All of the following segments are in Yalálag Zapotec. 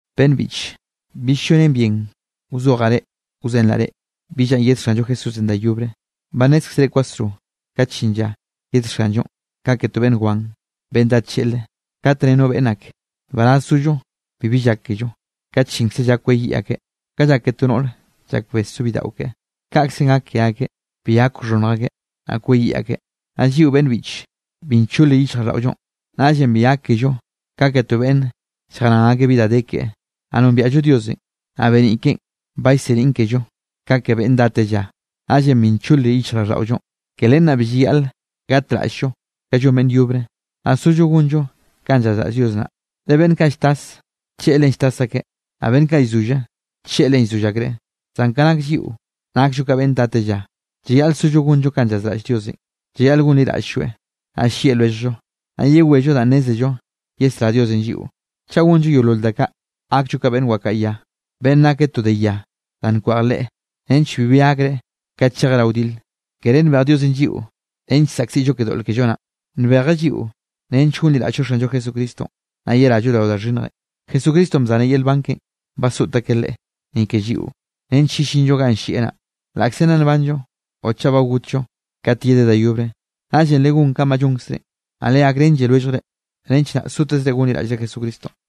Beꞌnn biꞌche, bill llonen bien wzojaꞌ wzenraꞌ reꞌ, bi lla yed Xanllo Jesúsenꞌ da yobre. Ba nnézkzere kwasro kat llin lla, yed Xanllonꞌ ka ke to beꞌnn wan, beꞌnn dá tlleꞌlre. Kat nne no beꞌnn ak: “Nbaraz zollo bibi llak kello”, kat llinkze lla kweyiꞌ akeꞌ. Ka llak ke to noꞌre llak bes so bidaꞌo keꞌe, kaꞌkzenꞌ gak ke akeꞌ, bi gak wxhonnj akeꞌ, naꞌ kweyiꞌ akeꞌ. Naꞌ lliꞌo beꞌnn biꞌche, bi nchole yichjraꞌlldaꞌollonꞌ, naꞌllenꞌ bi gak kello ka ke to beꞌnn lljaran akeꞌ bi da de keꞌe. Naꞌ nombiaꞌllo Diosenꞌ, naꞌ beniꞌ keꞌen ba llseniꞌn kello ka ke beꞌnn dá tella, naꞌllenꞌ bi nchole yichjraꞌlldaꞌollonꞌ. Ke len naꞌ bi llayaꞌl gatraꞌll-llo ka llon beꞌnn yobre, naꞌ sollo gonllo kanꞌ llazraꞌll Dios naꞌ. Le beꞌnn kaꞌ lltas, tlleꞌlenꞌ lltas akeꞌ, naꞌ beꞌnn kaꞌ llzolle, tlleꞌlenꞌ llzoll akreꞌ. Zan ka nak lliꞌo nakllo ka beꞌnne dá tella. Llayaꞌl sollo gonllo kanꞌ llazraꞌll Diosenꞌ. Llayaꞌl gonliraꞌll-lloeꞌ, naꞌ llieꞌ lwelljllo, naꞌ yewello danꞌ nnézello yesrá Diosenꞌ lliꞌo. Chaꞌ gonllo yeolol da kaꞌ, gakllo ka beꞌnn wakaꞌa ya, beꞌnne nake to de ya da nkweꞌj leꞌe, nench bibi gakreꞌ kat chejeꞌ rao wdile. Kere nbej Diosenꞌ lliꞌo nench saꞌkziꞌllo ke doꞌl kello naꞌn, nbejeꞌ lliꞌo nench gonliraꞌll-llo Xanllo Jesucristonꞌ, naꞌ yerallo rao da xhinnjenꞌ. Jesucristonꞌ bzaneꞌ yel nban keꞌe, basoꞌt akeꞌ Leꞌe ni ke lliꞌo, nench yellinllo ganꞌ llieꞌ naꞌ, laꞌkze nna nbanllo o chaꞌ ba gotllo kat yedeꞌ da yobre. Naꞌllenꞌ legón kanꞌ ba llonkzre, naꞌ leserén lwelljre, naꞌ legakrenlle lwelljre, nench naꞌ sotezre gonliraꞌllre Jesucristonꞌ.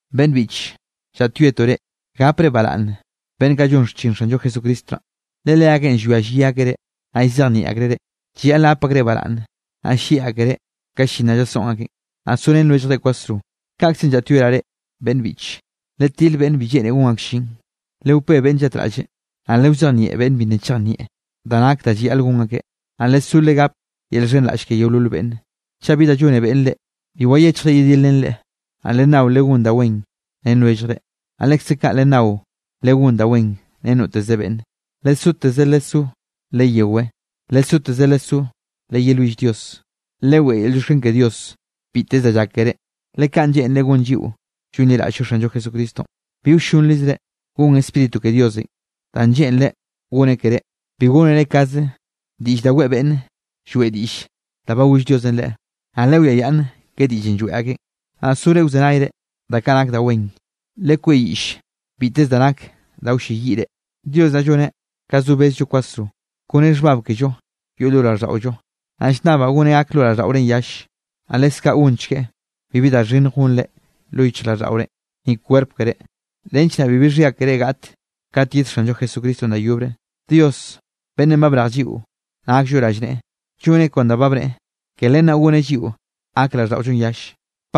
Beꞌnne biꞌche, llaꞌtyoetoꞌ reꞌ, gapre baraꞌnn beꞌnn kaꞌ llon xchin Xanllo Jesucristo naꞌ, le leakeꞌn llwia llyi akeꞌ reꞌ, naꞌ llzejnieꞌ akreꞌ reꞌ. Llayaꞌl gap akreꞌ baraꞌnne, naꞌ llieꞌ akereꞌ ka llin naꞌ llasoꞌn akeꞌn. Naꞌ sorén lwelljre kwasro. Kaꞌkzenꞌ llaꞌtyoeraꞌ reꞌ, beꞌnn biꞌche, letil beꞌnne bi lleꞌne gon ak llin, lewpé beꞌnne llatraꞌlle, naꞌ lewzejnieꞌ beꞌnne bi nna chejnieꞌ da nak da llayaꞌl gon akeꞌ. Naꞌ lesó legape yel llxhenraꞌll ke yeolol beꞌnne. Chaꞌ bi da llone beꞌnn reꞌ, bi wayechjre yedilrén leꞌe. Naꞌ lennao legón da wen ren lwelljre, naꞌ lekze kaꞌ lennao, legón da wen ren noteze beꞌnne. Lesoteze lesó leyewé. Lesoteze lesó leyelwill Dios. Leweꞌe yel llioxken ke Dios biteze da llak keré, le kaꞌn lleꞌnreꞌ gon lliꞌo llonliraꞌll-llo Xanllo Jesucristonꞌ. Bi wllonrizre gon Spíritu ke Diosenꞌ danꞌ lleꞌnreꞌ gone keré. Bi gónere kaze diꞌll da weꞌe beꞌnne lloeꞌ diꞌll da ba goll Diosenꞌ leꞌe. Naꞌ lewiayaꞌnn ke diꞌllenꞌ lloeꞌ akeꞌn, naꞌ sore wzenayre da kaꞌ nak da wen. Lekweꞌyiꞌll biteze da nak da wlleyiꞌ reꞌ. Dios naꞌ lloneꞌ ka zo bezllo kwasro kone xhbab kello yoꞌ lo raꞌlldaꞌollo. Naꞌ llnnabaꞌ goneꞌ gak lo raꞌlldaꞌorenꞌ yalle. Naꞌ leskaꞌ gonchgueꞌ bibi da xhinnj gonre lo yichjraꞌlldaꞌore, ni kwerp keré, nench naꞌ bibi xhia keré gaꞌt kat yed Xanllo Jesucristonꞌ da yobre. Dios beꞌnnenꞌ ba brej lliꞌo nakllo rallneꞌe lloneꞌ kon da ba bneꞌe, ke len naꞌ goneꞌ lliꞌo gak raꞌlldaꞌollonꞌ yalle.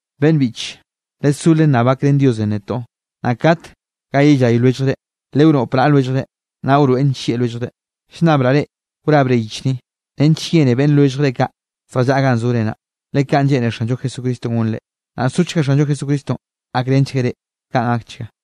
Beꞌnn biꞌche, lesó lennab gakrén Diosenꞌ netoꞌ. Naꞌ kat ga yellay lwelljre, lewnoꞌp naꞌa lwelljre, naꞌ wroeꞌn nllieꞌ lwelljre. Llnnabraꞌ reꞌ wrabre yich ni, nench yene beꞌnne lwelljre kaꞌ zjallaꞌa ganꞌ zore naꞌ, le kaꞌn lleꞌne Xanllo Jesucristonꞌ gonre. Naꞌ sochga Xanllo Jesucristonꞌ gakrenchgueꞌ reꞌ. Kaꞌn gakchga.